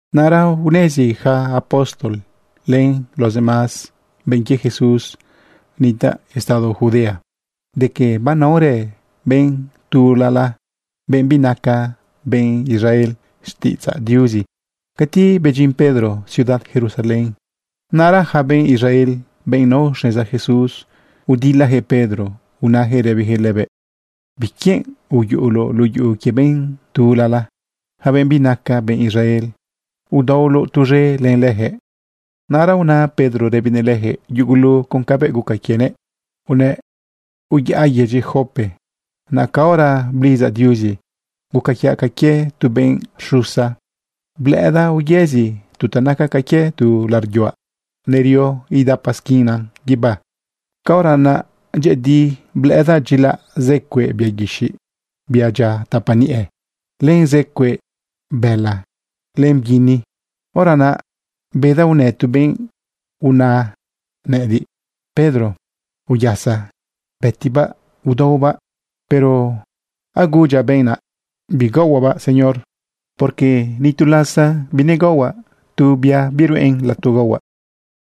Naꞌra unezi yaca apóstol len los demás benꞌ quie Jesús nitaꞌ estado Judea de que banaorë benꞌ tulala, benꞌ binaca benꞌ Israel, xtiꞌidzaꞌ Diuzi. Cati bedyin Pedro ciudad Jerusalén, naꞌra yaca benꞌ Israel, benꞌ nao xneza Jesús, udilayaquëꞌ Pedro unayaquëꞌ rëbiyaquëꞌ lëbëꞌ: ―¿Biquienꞌ uyuꞌuloꞌ luꞌu yuꞌu quie benꞌ tulala, yaca benꞌ binaca benꞌ Israel, udaolaoꞌ tuz̃e len leyaquëꞌ? Naꞌra una Pedro rëbinëꞌ leyaquëꞌ yugulu con cabëꞌ guca quienëꞌ unëꞌ: ―Uyaꞌa yedyi Jope. Naꞌ caora blidzaꞌ Diuzi, guca quiaꞌ ca quie tu benꞌ rxusa, blëꞌëdaꞌ uyëzi tu ta naca ca quie tu laꞌariꞌ yuaꞌ nerio idapa isquinan guibá. Caora unaꞌ dyëꞌëdi, blëꞌëdaꞌ dyilaꞌ zë cueꞌ bia guixiꞌ, bia dyia tapa niꞌe, len zë cueꞌ bëla, len bguini. Hora naꞌ bedaꞌ unë tu benꞌ una nëꞌëdiꞌ: “Pedro, uyasa. Bëtibaꞌ, udaobaꞌ.” Pero agudyaꞌ benꞌ naꞌ: “Bigaohuaꞌbaꞌ, Señor, porque ni tu lasa binegaohuaꞌ tu biruꞌen lato gaohuaꞌ.”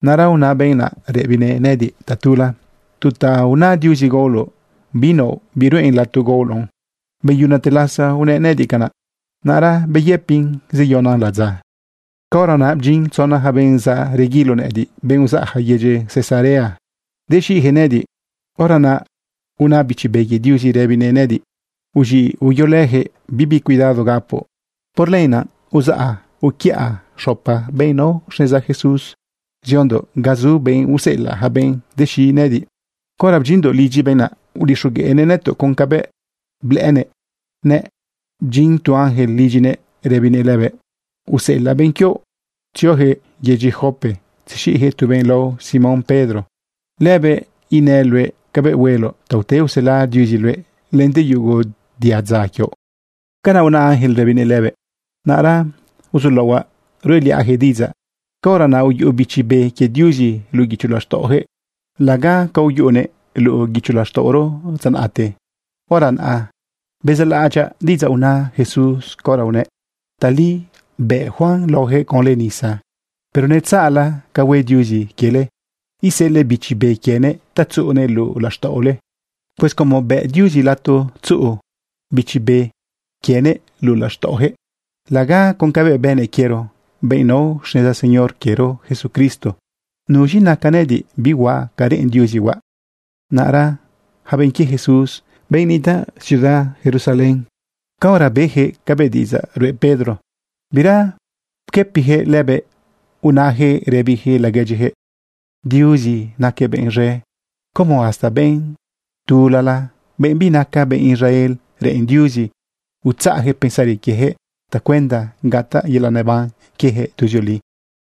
Naꞌra una benꞌ naꞌ rëbinëꞌ nëꞌëdiꞌ tatula: “Tu ta aona Diuzi gaoloꞌ, binaoꞌ biruꞌen lato gaoloꞌn.” Beyunate lasa unëꞌ nëꞌëdiꞌ canaꞌ, naꞌra beyëpin zeyonan ladza. Caora naꞌ bdyin tzona yaca benꞌ reguilo nëꞌëdiꞌ, benꞌ uzaꞌyaca yedyi Cesarea dexiꞌyaquëꞌ nëꞌëdiꞌ. Hora naꞌ una Bichi Be quie Diuzi rëbinëꞌ nëꞌëdiꞌ: “Uz̃iꞌ, uyolëyaquëꞌ. Bibi cuidado gapoꞌ.” Por lenaꞌ uzaꞌa uquiëꞌa xopa benꞌ nao xneza Jesús ziondoꞌ ga zu benꞌ useꞌelaꞌ yaca benꞌ dexiꞌ nëꞌëdiꞌ. Caora bdyindoꞌ lidyi benꞌ naꞌ, udixogueꞌnëꞌ nëtoꞌ con cabëꞌ blëꞌënëꞌ nëꞌ bdyin tu ángel lidyinëꞌ rëbinëꞌ lëbëꞌ: “Useꞌelaꞌ benꞌ quioꞌ tzioyaquëꞌ yedyi Jope tzexiꞌyaquëꞌ tu benꞌ lao Simón Pedro. Lëbëꞌ inëꞌ luëꞌ cabëꞌ hueloꞌ ta ute usela Diuzi luëꞌ lente yugo diadza quioꞌ.” Canaꞌ una ángel rëbinëꞌ lëbëꞌ. Naꞌra uzulaohuaꞌ ruꞌeliaꞌyaquëꞌ diꞌidzaꞌ, caora naꞌ uyuꞌu Bichi Be quie Diuzi luꞌu guicho laxtaꞌoyaquëꞌ laga ca uyuꞌunëꞌ luꞌu guicho laxtaꞌoro dza naꞌte. Hora naꞌ bezaꞌlaꞌadyaꞌ diꞌidzaꞌ una Jesús caora unëꞌ: “Tali bëꞌ Juan laole conlë nisa, pero netzaꞌla ca hue Diuzi quiele, iseꞌelëꞌ Bichi Be quienëꞌ ta tzuꞌunëꞌ luꞌu laxtaꞌole.” Pues como bëꞌ Diuzi lato tzuꞌu Bichi Be quienëꞌ luꞌu laxtaꞌoyaquëꞌ laga con cabëꞌ bënëꞌ quiero, benꞌ nao xneza Señor quiero Jesucristo, ¿nuz̃i naca nëꞌëdiꞌ bihuaꞌ ca reꞌen Diuzi huaꞌ? Naꞌra yaca benꞌ quie Jesús, benꞌ nitaꞌ ciudad Jerusalén, caora beyaquëꞌ cabëꞌ diꞌidzaꞌ ruꞌe Pedro, bira pquëpiyaquëꞌ lëbëꞌ, unayaquëꞌ rëbiyaquëꞌ laguedyiyaquëꞌ: ―Diuzi naquëꞌ benꞌ z̃e. Como hasta benꞌ tulala, benꞌ binaca benꞌ Israel, reꞌen Diuzi utzaꞌyaquëꞌ pensari quieyaquëꞌ tacuenda gataꞌ yelaꞌ neban quieyaquëꞌ tuzioli.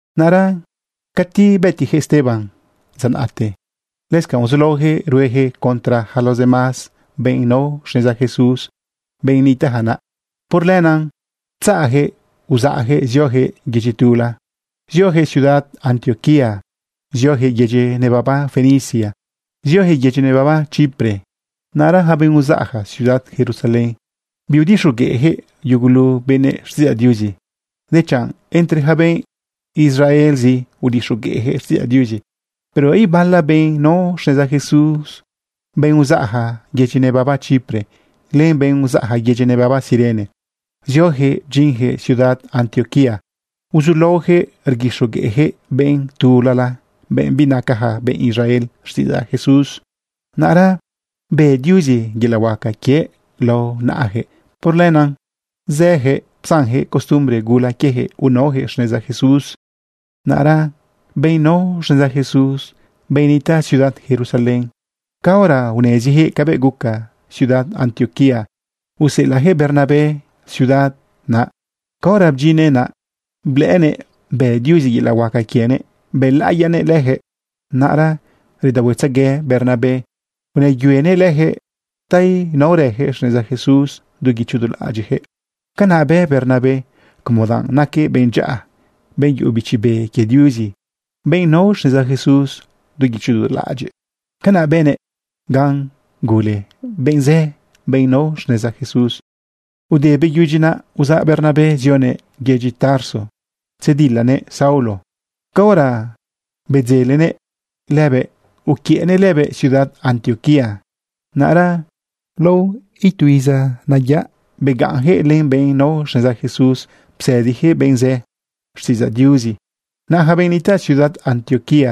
Naꞌra cati bëtiyaquëꞌ Esteban dza naꞌte, lëscanꞌ uzulaoyaquëꞌ rueyaquëꞌ contra yaca los demás benꞌ nao xneza Jesús, benꞌ nitaꞌja naꞌ. Por lenaꞌ bdzatzajëꞌ uzaꞌyaquëꞌ ziojëꞌ yedyi tula. Ziojëꞌ ciudad Antioquía, ziojëꞌ yedyi nebaba Fenicia, ziojëꞌ yedyi nebaba Chipre. Naꞌra yaca benꞌ uzaꞌja ciudad Jerusalén, biudixogueꞌyaquëꞌ yugulu benëꞌ xtiꞌidzaꞌ Diuzi, dechanꞌ entre yaca benꞌ Israelzi udixogueꞌjëꞌ xtiꞌidzaꞌ Diuzi. Pero ibala benꞌ nao xneza Jesús, benꞌ uzaꞌja yedyi nebaba Chipre, len benꞌ uzaꞌja yedyi nebaba Cirene, zioyaquëꞌ bdyinyaquëꞌ ciudad Antioquía uzulaoyaquëꞌ rguixogueꞌyaquëꞌ benꞌ tulala, benꞌ binacaja benꞌ Israel, xtiꞌidzaꞌ Jesús. Naꞌra bë Diuzi yelaꞌ huaca quiëꞌ lao naꞌayaquëꞌ. Por lenaꞌ zëyaquëꞌ psanyaquëꞌ costumbre gula quieyaquëꞌ, unaoyaquëꞌ xneza Jesús. Naꞌra benꞌ nao xneza Jesús, benꞌ nitaꞌ ciudad Jerusalén, caora uneziyaquëꞌ cabëꞌ guca ciudad Antioquía, useꞌelaꞌyaquëꞌ Bernabé ciudad naꞌ. Caora bdyinnëꞌ naꞌ, blëꞌënëꞌ bë Diuzi yelaꞌ huaca quienëꞌ, bëlaꞌiyanëꞌ leyaquëꞌ. Naꞌra redaohuetzegue Bernabé unëyuenëꞌ leyaquëꞌ ta inaorayaquëꞌ xneza Jesús du guicho du laꞌadyiꞌyaquëꞌ. Canaꞌ bë Bernabé como danꞌ naquëꞌ benꞌ dyaꞌa, benꞌ yuꞌu Bichi Be quie Diuzi, benꞌ nao xneza Jesús du guicho du laꞌadyiꞌ. Canaꞌ bënëꞌ gan gule benꞌ zë, benꞌ nao xneza Jesús. Ude beyudyi naꞌ, uzaꞌ Bernabé zionëꞌ yedyi Tarso tzedilanëꞌ Saulo. Caora bedzelenëꞌ lëbëꞌ, uquiëꞌnëꞌ lëbëꞌ ciudad Antioquía. Naꞌra lao tu iza nayaꞌ begaꞌnyaquëꞌ len benꞌ nao xneza Jesús psëdiyaquëꞌ benꞌ zë xtiꞌidzaꞌ Diuzi. Naꞌ yaca benꞌ nitaꞌ ciudad Antioquía,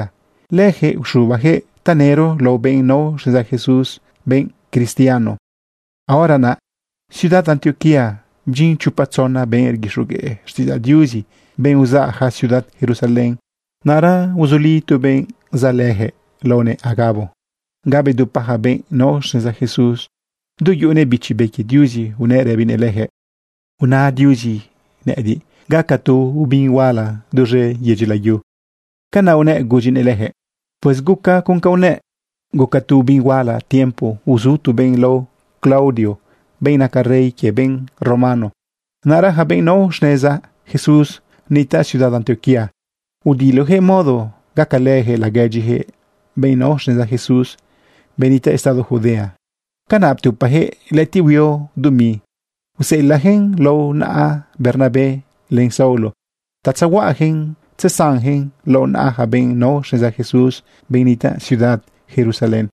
leyaquëꞌ uxubayaquëꞌ tanëro lao benꞌ nao xneza Jesús benꞌ cristiano. Caora naꞌ ciudad Antioquía bdyin chopa tzona benꞌ rguixogueꞌ xtiꞌidzaꞌ Diuzi, benꞌ uzaꞌyaca ciudad Jerusalén. Naꞌra uzuli tu benꞌ zaꞌ leyaquëꞌ laonëꞌ Agabo ga bedupa yaca benꞌ nao xneza Jesús. Du yuꞌunëꞌ Bichi Be quie Diuzi, unëꞌ rëbinëꞌ leyaquëꞌ: ―Una Diuzi nëꞌëdiꞌ gaca tu obin huala duz̃e yedyi layu. ―Canaꞌ unëꞌ gudyinëꞌ leyaquëꞌ. Pues gucan con ca unëꞌ. Guca tu obin huala tiempo uzu tu benꞌ lao Claudio, benꞌ naca rey quie benꞌ romano. Naꞌra yaca benꞌ nao xneza Jesús nitaꞌ ciudad Antioquía, udilojëꞌ modo gacalëyaquëꞌ laguedyiyaquëꞌ benꞌ nao xneza Jesús, benꞌ nitaꞌ estado Judea. Canaꞌ ptupayaquëꞌ lëꞌëtiꞌ huio dumi iseꞌelaꞌyaquëꞌn lao naꞌa Bernabé len Saulo ta tzehuaꞌayaquëꞌn tzesanyaquëꞌn lao naꞌa yaca benꞌ nao xneza Jesús, benꞌ nitaꞌ ciudad Jerusalén.